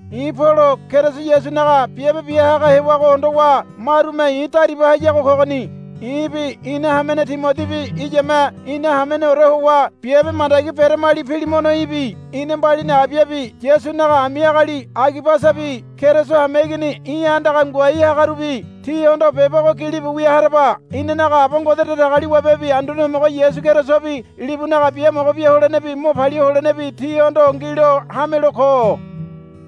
I̱ Polo Keriso Yasunaga biabe biahaga hewago hondowa marume i̱ dariba hayago kogoni. I̱bi ina hamene Timodibi iyame ina hameneore howa biabe mandagi beramali Pilimono í̠bi ina mbalini Abiabi Yasunaga ami agali Agibasabi Keriso hameigini í̠ andaga ngoai hagarubi tíhondo beba ogo gilibu wia haraba. Inanaga Aba Ngode Datagaliwabebi Anduane Homogo Yasu Kerisobi libunaga biamogo bia holenebi mo palia holenebi tíhondo ngilo hamelo ko.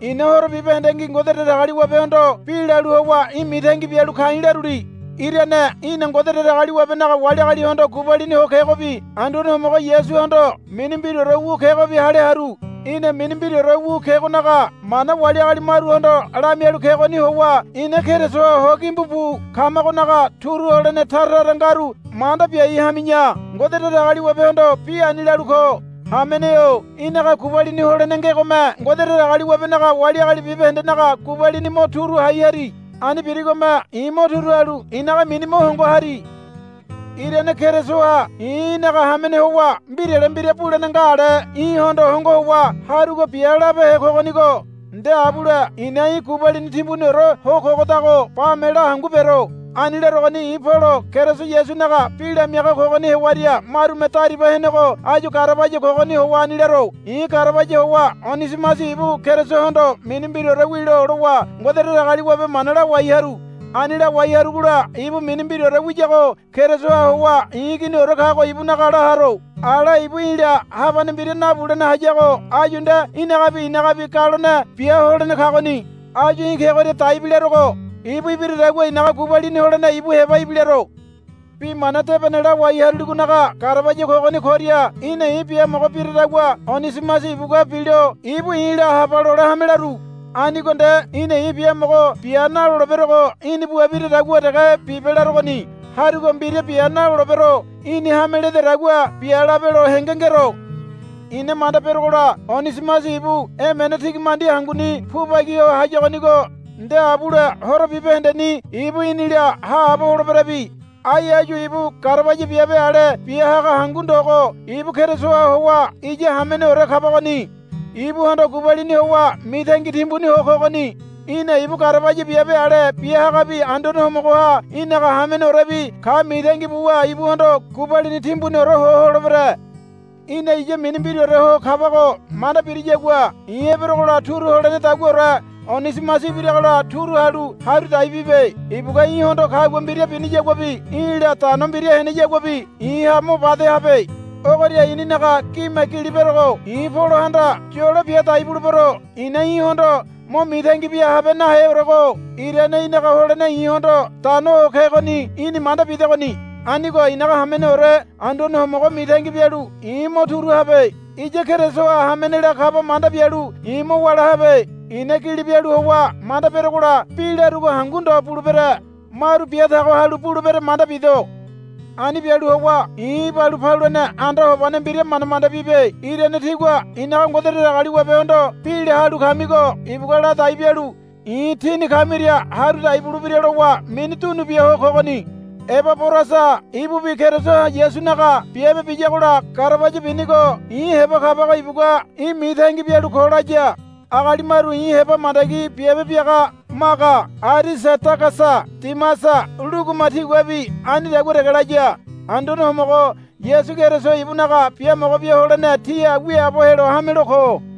I̱na horo bibahendengi Ngode Datagaliwabehondo bi lalu howa í̠ mitangi bialu ka̱i̱ laruli. Irane í̠na Ngode Datagaliwabenaga wali agalihondo gubalini ho kegobi Anduane Homogo Yasuhondo mini mbiraore wu kegobi hale haru. Í̠na mini mbiraore wu kegonaga mana wali agali maruhondo lamialu kegoni howa ina Kerisoha hogimbu bu kamagonaga turu holene tara tara ngaru manda biai hami̱ya Ngode Datagaliwabehondo bi ani lalu ko. Hamene-o í̠naga gubalini holene ngegome Ngode Datagaliwabenaga wali agali bibahendenaga gubalini mo turu hai hari. Ani birigome i̱ mo turu halu i̱naga mini mo hongo hari. Irane Kerisoha i̱ í̠naga hamene howa mbirale mbira bulene nga ale í̠hondo hongo howa, Harugo bia, labehe kogonigo. Nde abule i̱na í̠ gubalini timbuniore ho kogodago bame la hangu bero. Ani larogoni i̱ Polo Keriso Yasunaga bi lamiaga kogoni hewaria marume dariba henego áyu garabaya kogoni howa ani laro. I̱ garabaya howa Onisimasi ibu Kerisohondo mini mbiraore wilo lowa Ngode Datagaliwabe mana lawai haru. Ani lawai harugola ibu mini mbiraore wiyago Kerisoha howa i̱ iginiore kago ibunaga la haro. Ala ibu í̠la habane mbira nabulene hayago áyu nde í̠nagabi i̱nagabi galone biaholene kagoni. Áyu í̠ kegoria daibi larogo. Ibu ibiradagua i̱naga gubalini holene ibu heba ibilaro. Bi mana debene lawai haruligonaga garabaya kogoni koria í̠na i̱ biamogo biradagua Onisimasi ibugua bilo ibu i̱la, Haba, lole hame laru. Anigo nde í̠na i̱ biamogo bia naloleberogo í̠ni bua biradagua dege bibe larogoni. Harugo mbira bia nalolebero. Í̠ni hame lededagua bia labelo henge ngero. I̱na manda berogola Onisimasi ibu emene tigimandi hanguni pubagi ho hayagonigo nde abule horo bibahendeni ibu í̠nila haabo holeberabi. Ai áyu ibu garabaya biabe ale biahaga hangu ndogo ibu Kerisoha howa iya hameneore kabagoni. Ibuhondo gubalini howa mitangi timbuni ho kogoni. Í̠na ibu garabaya biabe ale biahagabi Anduane Homogoha í̠naga hameneorebi ka mitangi buwa ibuhondo gubalini timbuniore ho holebere. Í̠na iya mini mbiraore ho kabago manda biriyagua i̱ eberogola turu holenedaguaore Onisimasi ibiragola turu halu haru dai bibe. Ibugua í̠hondo kagua mbira biniyaguabi í̠la dano mbira heneyaguabi i̱ha mo bade habe. Ogoria i̱ninaga gime gili berogo. I̱ Polohanda yolo bia dai bulebero. I̱na í̠hondo mo mitangi bia habe naheorego irane í̠naga holene i̱hondo dano ho kegoni í̠ni manda bidegoni. Anigo i̱naga hameneore Anduane Homogo mitangi bialu i̱ mo turu habe. Iya Kerisoha hamenela kaba manda bialu i̱ mo wála habe. I̱na gili bialu howa manda berogola bi larugo hangu ndo bulebere. Maru biatago halu bulebere manda bido. Ani bialu howa i̱ ibalu paluene anda hobane mbira manda manda bibe. Irane tígua i̱naga Ngode Datagaliwabehondo bi la halu kamigo ibugua ladai bialu i̱ tíni kamiria haru dai bulebira lowa mini dunu bia ho kogoni. Ebaborasa ibubi Keriso Yasunaga biabe biyagola garabaya binigo i̱ heba kabago ibugua, Í̠ mitangi bialu ko, laya. Agali maru i̱ heba mandagi biabe biaga Maga Arisadagasa Dimasa Luguma tiguabi anidagua dege laya. Anduane Homogo Yasu Keriso ibunaga biamogo bia holene tíha wiaabo helo hamelo ko.